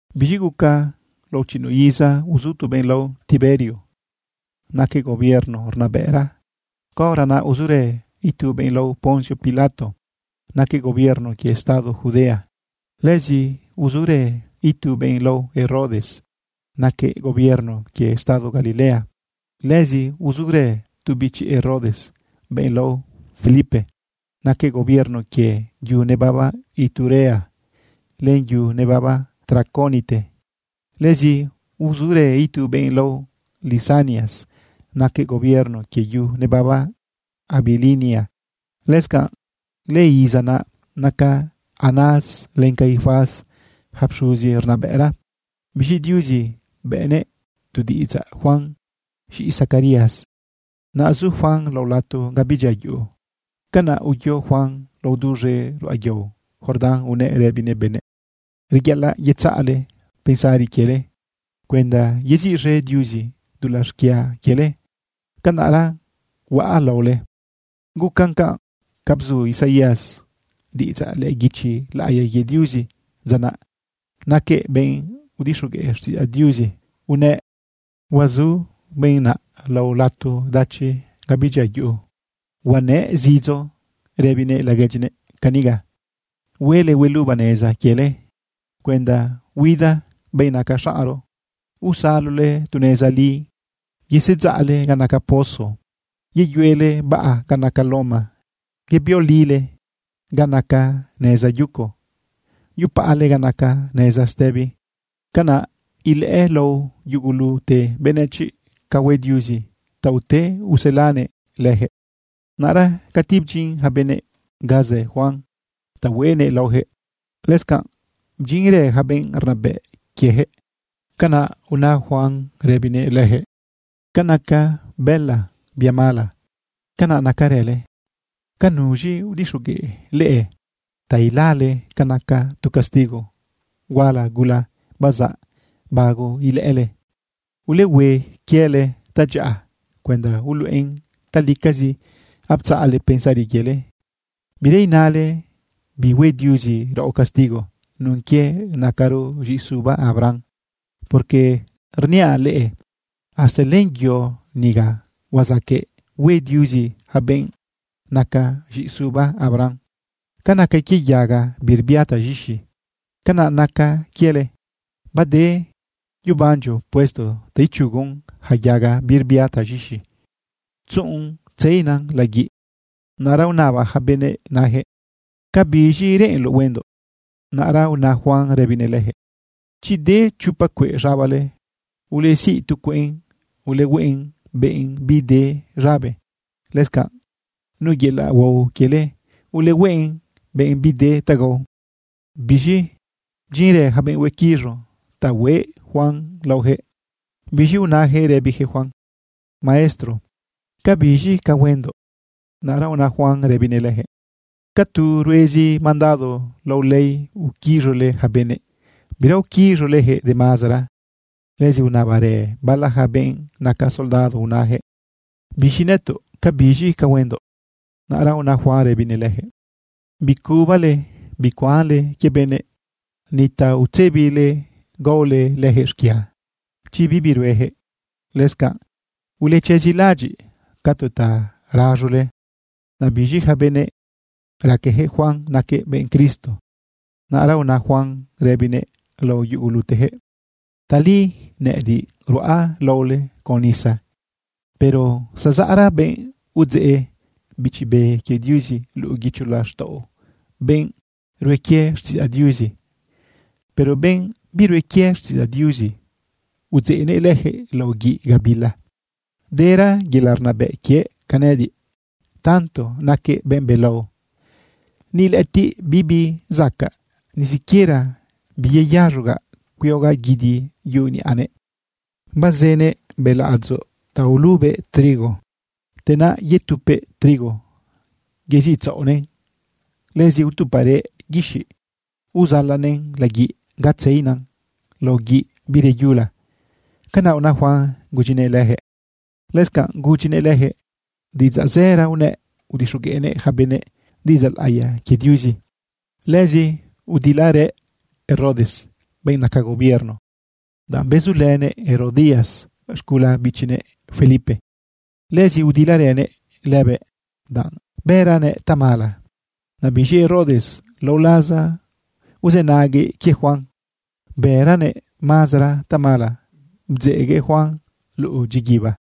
Biz̃i guca lao chiꞌinuꞌ iza uzu tu benꞌ lao Tiberio, naquëꞌ gobierno rnabëꞌra. Caora naꞌ uzurë itu benꞌ lao Poncio Pilato, naquëꞌ gobierno quie estado Judea. Lëzi uzurë itu benꞌ lao Herodes, naquëꞌ gobierno quie estado Galilea. Lëzi uzurë tu bichi Herodes, benꞌ lao Felipe, naquëꞌ gobierno quie yu nebaba Iturea len yu nebaba Traconite. Lëzi uzurë itu benꞌ lao Lisanias, naquëꞌ gobierno quie yu nebaba Abilinia. Lëscanꞌ lëiza naꞌ, naca Anás len Caifás yaca pxuzi rnabëꞌra. Biz̃i Diuzi bëꞌnëꞌ tu diꞌidzaꞌ Juan, z̃iꞌi Zacarías. Naꞌ zu Juan lao lato ga bidyia yuꞌu. Canaꞌ uyo Juan lao duz̃e ruꞌa yao Jordán unëꞌ rëbinëꞌ benëꞌ: “Reyaꞌalaꞌ yetzaꞌle pensari quiele cuenda yeziꞌz̃e Diuzi dulaꞌ xquia quiele, canaꞌra huaꞌ laole.” Gucan canꞌ ca bzu Isaías diꞌidzaꞌ lëꞌë guichi laꞌiya quie Diuzi dza naꞌ. Naquëꞌ benꞌ udixogueꞌ xtiꞌidzaꞌ Diuzi unëꞌ: Huazu benꞌ naꞌ lao lato dachi ga bidyia yuꞌu, huanëꞌ zidzo rëbinëꞌ laguedyinëꞌ caniga: “Huele hueluba neza quiele cuenda huida benꞌ naca xaꞌnro, usalole tu neza li. Yesedzaꞌle ga naca pozo, yeyuele baꞌa ga naca loma, yebiolile ga naca neza yuco, yupaꞌale ga naca neza stëbi. Canaꞌ ilëꞌë lao yugulute benëchiꞌ ca hue Diuzi ta ute uselanëꞌ leyaquëꞌ.” Naꞌra cati bdyin yaca benëꞌ ga zë Juan ta hueꞌnëꞌ laoyaquëꞌ, lëscanꞌ bdyinrë yaca benꞌ rnabëꞌ quieyaquëꞌ. Canaꞌ una Juan rëbinëꞌ leyaquëꞌ: ―¡Ca naca bëla bia mala, canaꞌ nacarële! ¿Ca nuz̃i udixogueꞌ leꞌe ta ilale ca naca tu castigo huala gula bazaꞌ bago ilëꞌële? Ulehue quiele tadyaꞌa cuenda uluꞌen talicazi aptzaꞌle pensari quiele. Bira inale: “Bihue Diuzi raꞌo castigo nun quie nacaro z̃iꞌi suba Abraham.” Porque rniaꞌ leꞌe, hasta len yo niga huazaqueꞌ hue Diuzi yaca benꞌ naca z̃iꞌisuba Abraham. Ca naca quie yaga birbia taz̃ixi, canaꞌ naca quiele. Bade yebandyo puesto ta ichugon yaca yaga birbia taz̃ixi tzuꞌun tzeina laguiꞌ. Naꞌra unaba yaca benëꞌ nayaquëꞌ: ―¿Cabiz̃i reꞌenloꞌ huendoꞌ? Naꞌra una Juan rëbinëꞌ leyaquëꞌ: ―Chi de chopa cueꞌ z̃abale, ulesiꞌ tu cueꞌn ulehueꞌn benꞌ bide z̃abe. Lëscanꞌ nu yelaꞌ huao quiele, ulehueꞌn benꞌ bide ta gao. Biz̃i bdyinrë yaca benꞌ huequiz̃u ta hueꞌ Juan laoyaquëꞌ. Biz̃i unayaquëꞌ rëbiyaquëꞌ Juan: ―Maestro, ¿cabiz̃i ca huendoꞌ? Naꞌra una Juan rëbinëꞌ leyaquëꞌ: ―Ca tu ruezi mandado lao ley uquiz̃ule yaca benëꞌ, bira uquiz̃uleyaquëꞌ de mazara. Lëzi unabarë bala yaca benꞌ naca soldado unayaquëꞌ: ―Biz̃i nëtoꞌ, ¿cabiz̃i ca huendoꞌ? Naꞌra una Juan rëbinëꞌ leyaquëꞌ: ―Bicubale bicuanle quie benëꞌ. Ni ta utzebile gaole leyaquëꞌ xquia, chi bibi rueyaquëꞌ. Lëscanꞌ ulechezilaꞌadyiꞌ ca tu ta raz̃ule. Naꞌ biz̃i yaca benëꞌ raqueyaquëꞌ Juan naquëꞌ benꞌ Cristo. Naꞌra una Juan rëbinëꞌ lao yuguluteyaquëꞌ: ―Tali nëꞌëdiꞌ ruꞌa laole con nisa, pero zazaꞌra benꞌ udzeꞌ Bichi Be quie Diuzi luꞌu guicho laxtaꞌo benꞌ rue quie xtiꞌidzaꞌ Diuzi. Pero benꞌ birue quie xtiꞌidzaꞌ Diuzi, udzeꞌnëꞌ lëjëꞌ lao guiꞌ gabila. Dera yelaꞌ rnabëꞌ quiëꞌ ca nëꞌëdiꞌ. Tanto naquëꞌ benꞌ belao, ni lëꞌëtiꞌ bibi zacaꞌ ni siquiera biyeyaz̃ogaꞌ cuiogaꞌ guidi yuꞌu niꞌanëꞌ. Bazënëꞌ beladzoꞌ ta ulubëꞌ trigo. Te naꞌ yetupëꞌ trigo yeziꞌtzaꞌonëꞌn. Lëzi utuparëꞌ guixiꞌ uzalanëꞌn laguiꞌ ga tzeina lao guiꞌ bireyula. ―Canaꞌ una Juan gudyinëꞌ leyaquëꞌ. Lëscanꞌ gudyinëꞌ leyaquëꞌ diꞌidzaꞌ zëra unëꞌ udixogueꞌnëꞌ yaca benëꞌ diꞌidzaꞌ laꞌiya quie Diuzi. Lëzi udilarëꞌ Herodes, benꞌ naca gobierno, danꞌ bezulënëꞌ Herodías z̃gula bichinëꞌ Felipe. Lëzi udilarënëꞌ lëbëꞌ danꞌ bëranëꞌ tamala. Naꞌ biz̃i Herodes, lao laza uzënaguëꞌ quie Juan, bërëlëꞌ mazara tamala, bdzeꞌguëꞌ Juan luꞌu dyiguiba.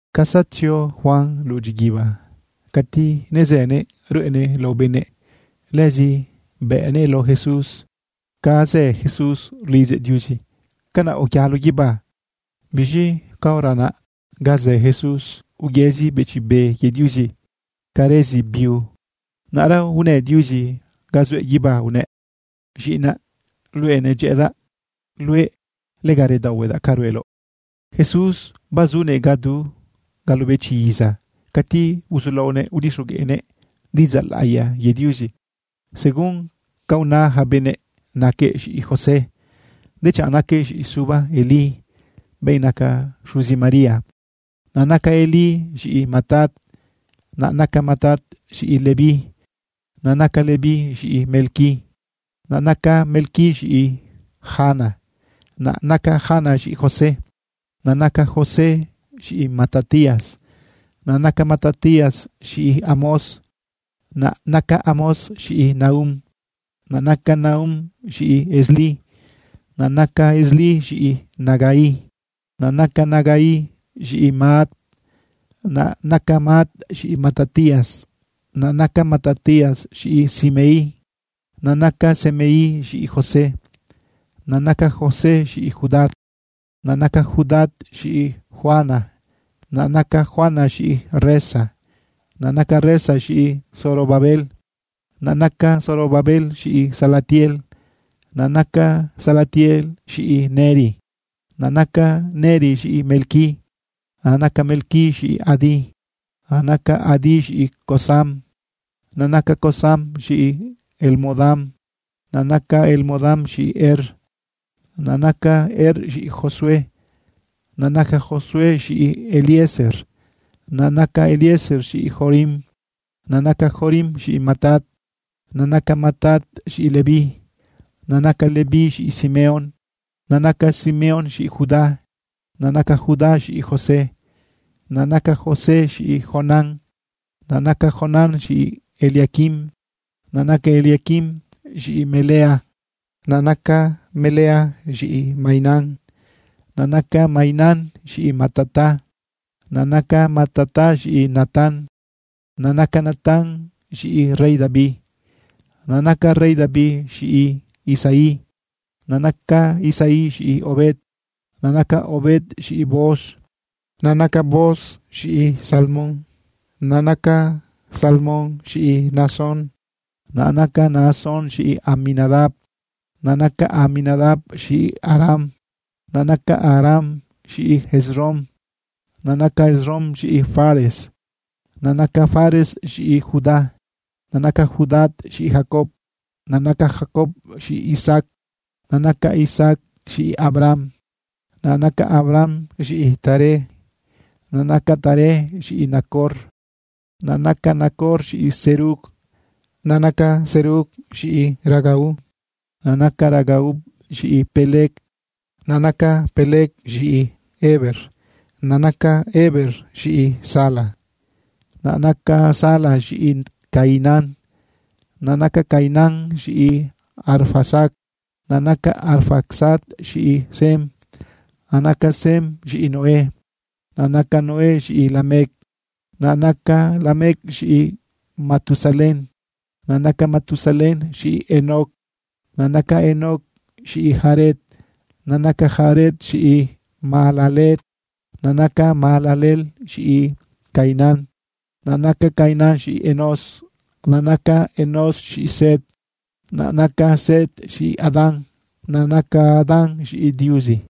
Ca zatzio Juan luꞌu dyiguiba, cati nezënëꞌ ruꞌenëꞌ lao benëꞌ, lëzi bëꞌnëꞌ lao Jesús. Ca zë Jesús rlidzëꞌ Diuzi, canaꞌ uyalo guibá. Biz̃i caora naꞌ ga zë Jesús, uyëzi Bichi Be quie Diuzi ca rëzi biu. Naꞌra unë Diuzi ga zuëꞌ guibá unëꞌ: ―Z̃iꞌinaꞌ luëꞌ. Nedyëꞌëdaꞌ luëꞌ. Lega redaohuedaꞌ ca rueloꞌ. Jesús bazunëꞌ ca du galobechi iza cati uzulaonëꞌ udixogueꞌnëꞌ diꞌidzaꞌ laꞌiya quie Diuzi. Según ca una yaca benëꞌ naquëꞌ z̃iꞌi José, dechanꞌ naquëꞌ z̃iꞌi suba Elí, benꞌ naca xuzi María. Naꞌ naca Elí z̃iꞌi Matat, naꞌ naca Matat z̃iꞌi Leví, naꞌ naca Leví z̃iꞌi Melqui, naꞌ naca Melqui z̃iꞌi Jana, naꞌ naca Jana z̃iꞌi José, naꞌ naca José z̃iꞌi Matatías, naꞌ naca Matatías z̃iꞌi Amós, naꞌ naca Amós z̃iꞌi Nahum, naꞌ naca Nahum z̃iꞌi Esli, naꞌ naca Esli z̃iꞌi Nagai, naꞌ naca Nagai z̃iꞌi Maat, naꞌ naca Maat z̃iꞌi Matatías, naꞌ naca Matatías z̃iꞌi Semei, naꞌ naca Semei z̃iꞌi José, naꞌ naca José z̃iꞌi Judá, naꞌ naca Judá z̃iꞌi Joana, naꞌ naca Joana z̃iꞌi Resa, naꞌ naca Resa z̃iꞌi Zorobabel, naꞌ naca Zorobabel z̃iꞌi Salatiel, naꞌ naca Salatiel z̃iꞌi Neri, naꞌ naca Neri z̃iꞌi Melqui, naꞌ naca Melqui z̃iꞌi Adi, naꞌ naca Adi z̃iꞌi Cosam, naꞌ naca Cosam z̃iꞌi Elmodam, naꞌ naca Elmodam z̃iꞌi Er, naꞌ naca Er z̃iꞌi Josué, naꞌ naca Josué z̃iꞌi Eliezer, naꞌ naca Eliezer z̃iꞌi Jorim, naꞌ naca Jorim z̃iꞌi Matat, naꞌ naca Matat z̃iꞌi Leví, naꞌ naca Leví z̃iꞌi Simeón, naꞌ naca Simeón z̃iꞌi Judá, naꞌ naca Judá z̃iꞌi José, naꞌ naca José z̃iꞌi Jonán, naꞌ naca Jonán z̃iꞌi Eliaquim, naꞌ naca Eliaquim z̃iꞌi Melea, naꞌ naca Melea z̃iꞌi Mainán, naꞌ naca Mainán z̃iꞌi Matata, naꞌ naca Matata z̃iꞌi Natán, naꞌ naca Natán z̃iꞌi rey David, naꞌ naca rey David z̃iꞌi Isaí, naꞌ naca Isaí z̃iꞌi Obed, naꞌ naca Obed z̃iꞌi Booz, naꞌ naca Booz z̃iꞌi Salmón, naꞌ naca Salmón z̃iꞌi Naasón, naꞌ naca Naasón z̃iꞌi Aminadab, naꞌ naca Aminadab z̃iꞌi Aram, naꞌ naca Aram z̃iꞌi Esrom, naꞌ naca Esrom z̃iꞌi Fares, naꞌ naca Fares z̃iꞌi Judá, naꞌ naca Judá z̃iꞌi Jacob, naꞌ naca Jacob z̃iꞌi Isaac, naꞌ naca Isaac z̃iꞌi Abraham, naꞌ naca Abraham z̃iꞌi Taré, naꞌ naca Taré z̃iꞌi Nacor, naꞌ naca Nacor z̃iꞌi Serug, naꞌ naca Serug z̃iꞌi Ragau, naꞌ naca Ragau z̃iꞌi Peleg, naꞌ naca Peleg z̃iꞌi Heber, naꞌ naca Heber z̃iꞌi Sala, naꞌ naca Sala z̃iꞌi Cainán, naꞌ naca Cainán z̃iꞌi Arfaxad, naꞌ naca Arfaxad z̃iꞌi Sem, naꞌ naca Sem z̃iꞌi Noé, naꞌ naca Noé z̃iꞌi Lamec, naꞌ naca Lamec z̃iꞌi Matusalén, naꞌ naca Matusalén z̃iꞌi Enoc, naꞌ naca Enoc z̃iꞌi Jared, naꞌ naca Jared z̃iꞌi Mahalaleel, naꞌ naca Mahalaleel z̃iꞌi Cainán, naꞌ naca Cainán z̃iꞌi Enós, naꞌ naca Enós z̃iꞌi Set, naꞌ naca Set z̃iꞌi Adán, naꞌ naca Adán z̃iꞌi Diuzi.